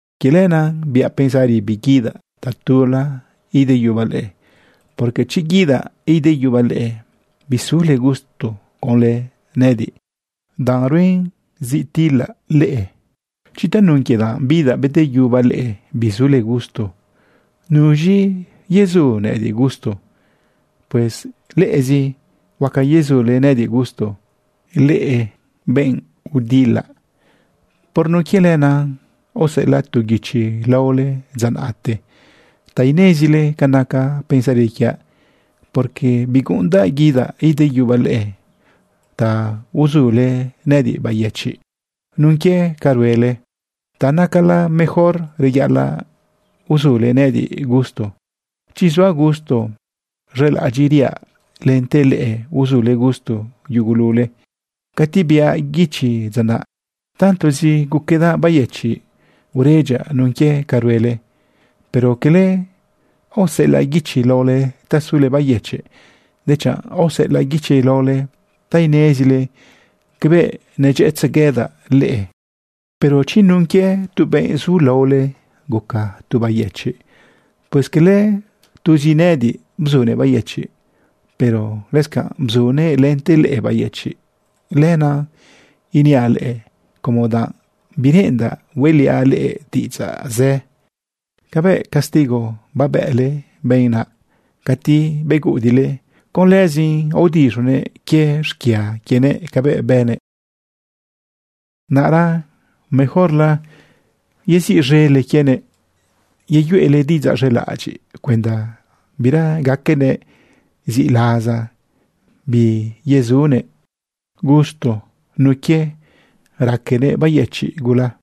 Quie lenaꞌ biaꞌ pensari biguidaꞌ tatula ideyubaꞌ leꞌe, porque chi guidaꞌ ideyubaꞌ leꞌe, bisule gusto conlë nëꞌëdiꞌ danꞌruen zi tilaꞌ leꞌe. Chi tanun quie danꞌ bidaꞌ bedeyubaꞌ leꞌe bisule gusto, ¿nuz̃i yezu nëꞌëdiꞌ gusto? Pues leꞌezi huaca yezule nëꞌëdiꞌ gusto, leꞌe benꞌ udilaꞌ. Por nun quie lenaꞌ aoseꞌelaꞌ tu guichi laole dza naꞌte ta inezile ca naca pensari quiaꞌ, porque biguꞌundaꞌ guidaꞌ ideyubaꞌ leꞌe ta uzule nëꞌëdiꞌ bayëchiꞌ nun quie ca ruele. Ta nacalá mejor reyaꞌalaꞌ uzule nëꞌëdiꞌ gusto. Chi zuaꞌ gusto, z̃elaꞌadyiꞌriaꞌ lente leꞌe huazule gusto yugulule. Cati biaꞌ guichi dza naꞌ, tantozi guquedaꞌ bayëchiꞌ, uredyaꞌ nun quie ca ruele. Pero cala aoseꞌelaꞌ guichi laole ta sule bayëchiꞌ, dechanꞌ aoseꞌelaꞌ guichi laole ta inezile cabëꞌ nedyëꞌëtzeguedaꞌ leꞌe. Pero chi nun quie tu benꞌ zu ladole guca tu bayëchiꞌ, pues cala tuzi nëꞌëdiꞌ bzunëꞌ bayëchiꞌ, pero lëscanꞌ bzunëꞌ lente leꞌe bayëchiꞌ. Lenaꞌ iniaꞌ leꞌe como danꞌ bireꞌendaꞌ hueꞌliaꞌ leꞌe diꞌidzaꞌ zë. Cabëꞌ castigo babële benꞌ naꞌ cati beguꞌudiꞌle, con lëzin aodiz̃unëꞌ quie xquia quienëꞌ cabëꞌ bënëꞌ. Naꞌra mejorla yeziꞌz̃ele quienëꞌ yeyuele diꞌidzaꞌ z̃elaꞌadyiꞌ cuenda bira gaquenëꞌ ziꞌlaza biyezunëꞌ gusto nun quie raquenëꞌ bayëchiꞌ gula.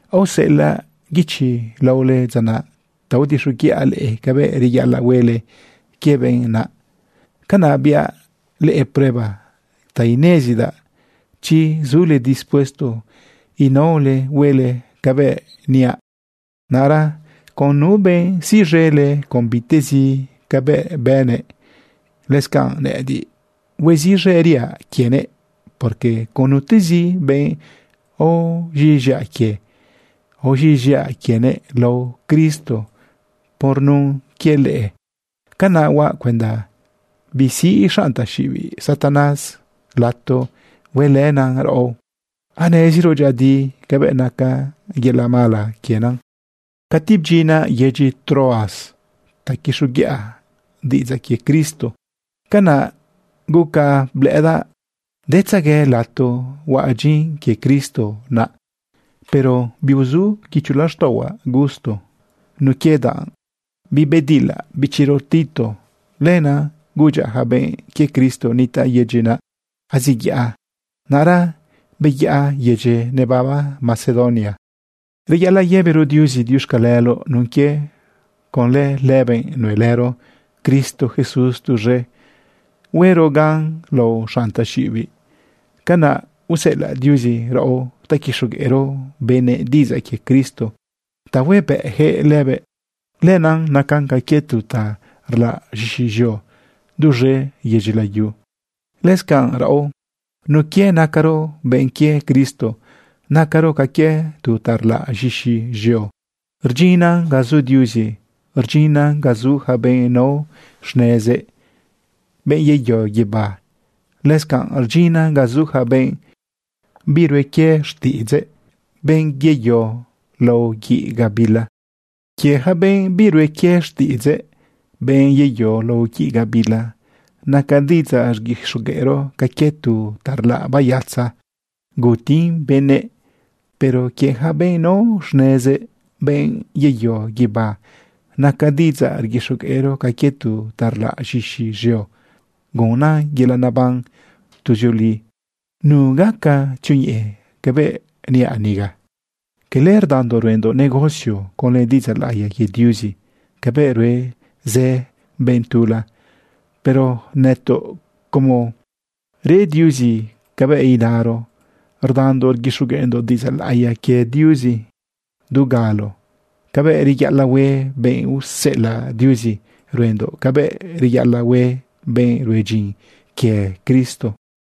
Aoseꞌelaꞌ guichi laole dza naꞌ ta aodixoguiꞌa leꞌe cabëꞌ reyaꞌalaꞌ huele quie benꞌ naꞌ. Canaꞌ biaꞌ leꞌe prueba ta inezdaꞌ chi zule dispuesto inaole huele cabëꞌ niaꞌ. Naꞌra con nu benꞌ siꞌz̃ele con bitiꞌtezi cabëꞌ bënëꞌ, lëscanꞌ nëꞌëdiꞌ hueziꞌz̃eriaꞌ quienëꞌ, porque con nutezi benꞌ aoz̃iꞌz̃iaꞌ quie, aoz̃iꞌz̃iaꞌ quienëꞌ lao Cristo por nun quie leꞌe. Canaꞌ huaꞌ cuenda bisiꞌ xanꞌ taxiꞌibiꞌ Satanás lato huelënan raꞌo. Aneziro dyëꞌëdi cabëꞌ nacan yelaꞌ mala quienan. Cati bdyinaꞌ yedyi Troas ta quixoguiꞌa diꞌidzaꞌ quie Cristo, canaꞌ guca blëꞌëdaꞌ detzegue lato huaꞌ dyin quie Cristo naꞌ. Pero biuzu guicho laxtaꞌohuaꞌ gusto nun quie ta bibedilaꞌ bichiro Tito. Lenaꞌ gudyaꞌ ja benꞌ quie Cristo nitaꞌ yedyi naꞌ aziyaꞌa. Naꞌra beyaꞌa yedyi nebaba Macedonia. Reyaꞌalaꞌ yëbiro Diuzi diuxcaleloꞌ nun quie conlë lëbëꞌ nuelëro Cristo Jesús tuz̃e huero gan lao xanꞌ taxiꞌibiꞌ. Canaꞌ useꞌelaꞌ Diuzi raꞌo ta quixogueꞌro benëꞌ diꞌidzaꞌ quie Cristo ta huebëꞌjëꞌ lëbëꞌ. Lenaꞌ nacan ca quie tu ta rlaꞌ z̃ixi z̃eo duz̃e yedyi layu. Lëscanꞌ raꞌo, nun quie nacaro benꞌ quie Cristo, nacaro ca quie tu ta rlaꞌ z̃ixi z̃eo rdyinnan ga zu Diuzi, rdyinnan ga zu ja benꞌ nao xnezëꞌ, benꞌ yeyo guibá. Lëscanꞌ rdyinnan ga zu ja benꞌ birue quie xtiꞌidzëꞌ, benꞌ yeyo lao guiꞌ gabila. Quie ja benꞌ birue quie xtiꞌidzëꞌ, benꞌ yeyo lao guiꞌ gabila, naca diꞌidzaꞌ rguixogueꞌro ca quie tu ta rlaꞌ bayatza gutin benëꞌ. Pero quie ja benꞌ nao xnezëꞌ, benꞌ yeyo guibá, naca diꞌidzaꞌ rguixogueꞌro ca quie tu ta rlaꞌ z̃ixi z̃eo gunnan yelaꞌ neban tuzioli. ¿Nu gaca tzioñeꞌe cabëꞌ niaꞌ niga? Cala rdandoꞌ ruendoꞌ negocio conlë diꞌidzaꞌ laꞌiya quie Diuzi cabëꞌ rue zë benꞌ tula, pero nëtoꞌ, como re Diuzi cabëꞌ inaro, rdandoꞌ rguixogueꞌndoꞌ diꞌidzaꞌ laꞌiya quie Diuzi du galo cabëꞌ reyaꞌalaꞌ hue benꞌ useꞌelaꞌ Diuzi. Ruendoꞌ cabëꞌ reyaꞌalaꞌ hue benꞌ rue dyin quie Cristo.